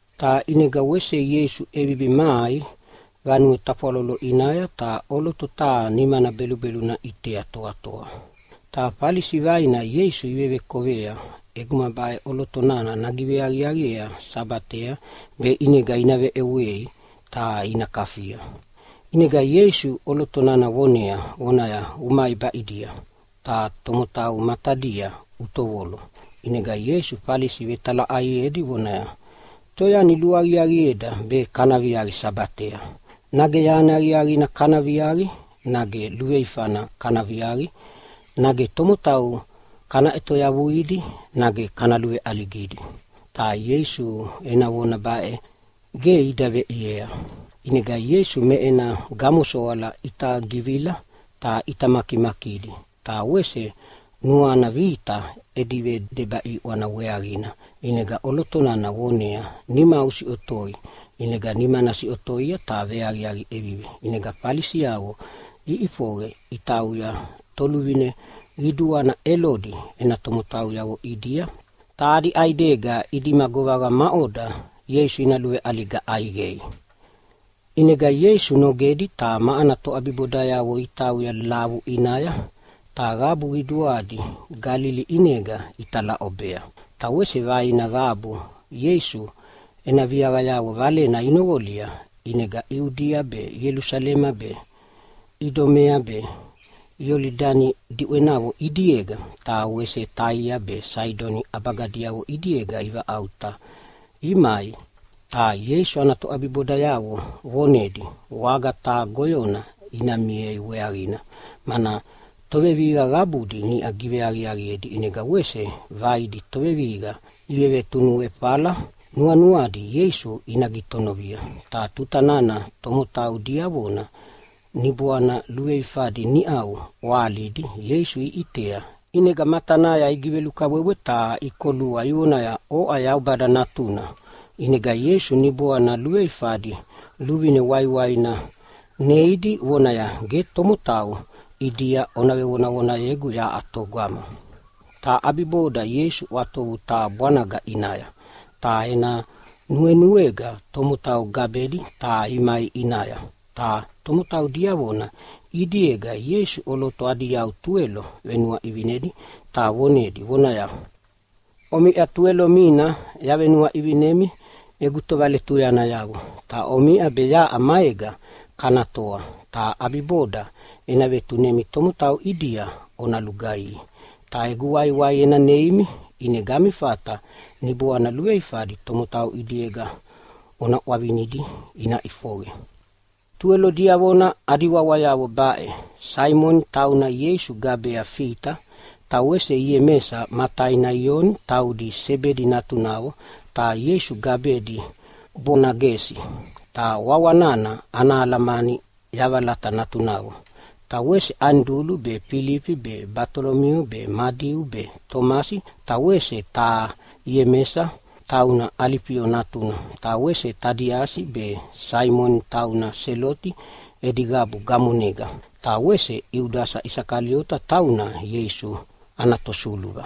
Ta ʼinega wese Ieisu ʼevivi mai vanue tafwalolo ʼinaya, ta ʼoloto taha nimana belubeluna ʼitea toatoa. Ta Falisi vaina Ieisu ivevekovea ʼeguma baʼe ʼoloto nana nagiveaqiaqiea Sabatea, be ʼinega ina veʼewei ta ina kafia. ʼInega Ieisu ʼoloto nana vonea vonaya, “Umai baʼidia, ta tomotau matadia utovolo!” ʼInega Ieisu Falisi vetalaʼaiedi vonaya, “Toyani luaqiaqieda be kana viaqi Sabatea? Nage yani aqiaqina kana viaqi, nage luveifana kana viaqi? Nage tomotau kana ʼetoyavuidi, nage kana luveʼaligidi?” Ta Ieisu ena vona baʼe ge ida veʼiea. ʼInega Ieisu me ena gamosoala ʼita givila ta ʼita makimakidi, ta wese nuana vita edi vedeba ʼiʼwana weaqina. ʼInega ʼoloto nana voneaya, “Nimau usiʼotoi!” ʼInega nimana siʼotoia ta veaqiaqi ʼevivi. ʼInega Falisiavo iʼifoqe itauya toluvine qiduana Elodi ena tomotauyavo ʼidia, ta adi ʼaidega idima govaqa maʼoda Ieisu ina luveʼaliga ʼaiqei. ʼInega Ieisu nogedi ta ma ana toʼabibodayavo itauya lavu ʼinaya, ta qabu qiduana Galili ʼinega italaʼobea. Ta wese vaina qabu Ieisu ena viaqayavo valena inoqolia, ʼinega Iudia be, Ielusalema be, Idumea be Iolidani diʼwenavo ʼidiega ta wese Taia be Saidoni ʼabaganavo ʼidiega ivaʼauta imai. Ta Ieisu ana toʼabibodayavo vonedi waga taha goyona ina miea weaqina, mana tovevihiqa qabudi niʼa giveaqiaqiedi, ʼinega wese vaidi tovevihiqa ivevetunuefaefala nuanuadi Ieisu ina gitonovia. Ta tuta nana tomotau diavona niboana luveifadi niʼau iʼwahalidi Ieisu iʼitea ʼinega matanaya igivelukabwebwe ta ikolua ivonaya, “Oʼa Yaubada Natuna.” ʼInega Ieisu niboana luveifadi luvine waiwaina neidi vonaya, “Ge tomotau ʼidia ona vevonavonayegu yaʼa togama!” Ta ʼabibodanaya Ieisu ʼwatovu taha bwanaga ʼinaya, ta ena nuenuega tomotau gabedi ta imai ʼinaya. Ta tomotau diavona ʼidiega Ieisu ʼoloto adi yau tuwelo venuaʼivinedi, ta vonedi vonaya, “Omiʼa tuwelo mina yavenuaʼivinemi egu tovaletuyanayavo, ta omiʼa be yaʼa maega kana toa, ta ʼabiboda ena vetunemi tomotau ʼidia ona lugaihi. Ta egu waiwai ena neimi ʼinega ami fata niboana luveifadi tomotau ʼidiega ona ʼwavinidi ina ʼifoqe.” Tuwelo diavona adi wawayavo baʼe: Saimoni (tauna Ieisu gabea Fita), ta wese Iemesa ma taina Ioni, taudi Sebedi natunavo ta Ieisu gabedi Bonagesi (ta wawa nana ana alamani yavalata natunavo), ta wese Anidulu be, Filifi be, Batolomio be, Madiu be, Tomasi ta wese taha Iemesa, tauna Alifio natuna, ta wese Tadiasi be, Saimoni tauna Seloti edi qabu gamonega, ta wese Iudasa Isakaliota, tauna Ieisu ana tosuluva.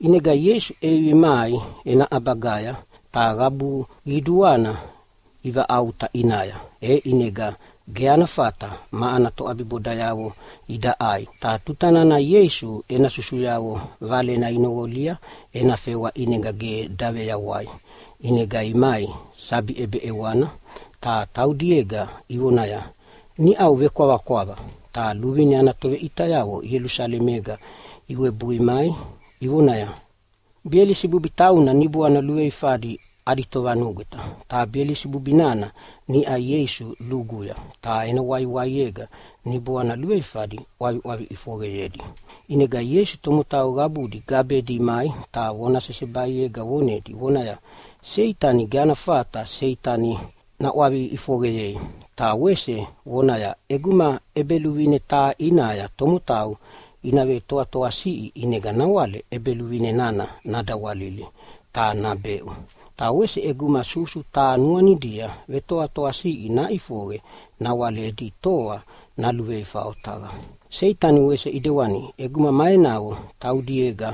ʼInega Ieisu ʼevivi mai ena ʼabagaya, ta qabu qiduana ivaʼauta ʼinaya, e ʼinega ge ana fata ma ana toʼabibodayavo ida ʼai. Ta tuta nana Ieisu ena susuyavo valena inoqolia ena fewa ʼinega ge daveyawaia, ʼinega imai sabi ʼebeʼewana ta taudiega ivonaya, “Niʼau vekwavakwava.” Ta luvine ana toveʼitayavo Ielusalemega iwebui mai ivonaya, “Belisibubi tauna niboana luveifadi adi tovanugweta. Ta Belisibubi nana niʼa Ieisu luguya, ta ena waiwaiega niboana luveifadi ʼwaviʼwavi ʼifoqeyedi.” ʼInega Ieisu tomotau qabudi gabedi imai ta vona sesebaiega vonedi vonaya, “Seitani ge ana fata Seitani naʼwavi ʼifoqeyei.” Ta wese vonaya, “ʼEguma ʼebeluvine taha ʼinaya tomotau ina vetoatoasiʼi, ʼinega nawale ʼebeluvine nana nadawalili ta nabeʼu. Ta wese ʼeguma susu taha nuanidia vetoatoasiʼi naʼifoqe e nawale edi toa naluveifa otaqa. Seitani wese ʼidewana, ʼeguma ma enavo taudiega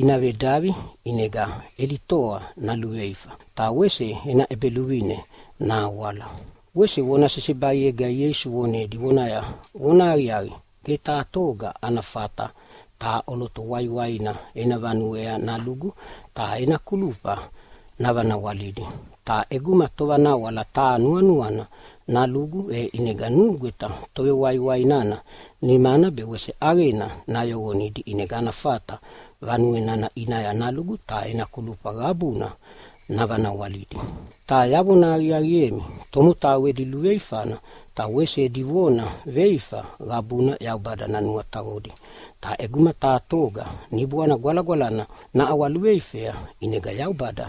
ina vedavi ʼinega edi toa naluveifa ta wese ena ʼebeluvine nahawala.” Wese vona sesebaiega Ieisu vonedi vonaya, “Vonahaqiaqi, ge taha toga ana fata taha ʼoloto waiwaina ena vanuea nalugu ta ena kulufa navanawalidi. Ta ʼeguma tovanawala taha nuanuana nalugu, e ʼinega nugweta tovewaiwai nana nimana be wese ʼaqena nayoqonidi, ʼinega ana fata vanue nana ʼinaya nalugu ta kulufa qabuna navanawalidi. Ta yavona aqiaqiemi, tomotau edi luveifana ta wese edi vona veifa qabuna Yaubada nanuataqodi, ta ʼeguma taha toga Niboana Gwalagwalana naʼawaluveifea ʼinega Yaubada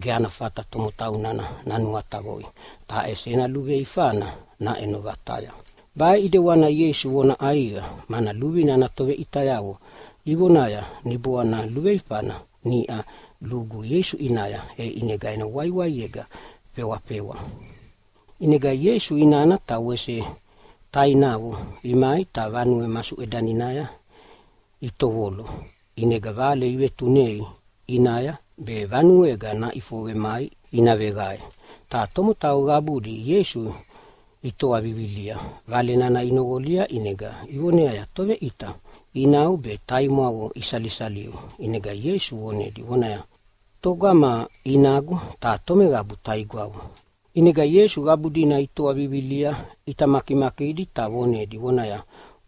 ge ana fata tomotau nana nanuataqoi, ta ʼesi ena luveifana naʼeno vataya.” Baʼe ʼidewana Ieisu vona ʼaiqa mana luvine ana toveʼitayavo ivonaya, “Niboana luveifana niʼa lugu Ieisu ʼinaya, e ʼinega ena waiwaiega fewafewa.” ʼInega Ieisu inana ta wese tainavo imai ta vanue masuʼedaninaya itovolo, ʼinega vale ivetunei ʼinaya be vanuega naʼifoqe mai ina veqae. Ta tomotau qabudi Ieisu itoa vivilia vale nana inoqolia ʼinega ivoneaya, “Toveʼita, inau be taimwavo isalisaliu.” ʼInega Ieisu vonedi vonaya, “Togama inagu ta tomeqabu taigwavo?” ʼInega Ieisu qabu dina itoa vivilia ʼita makimakidi ta vonedi vonaya,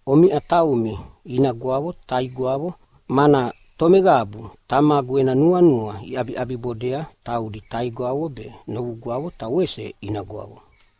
“Omiʼa taumi inagwavo ta taigwavo. Mana tomeqabu Tamagu ena nuanua iʼabiʼabibodea e taudi taigwavo be, novugwavo ta wese inagwavo.”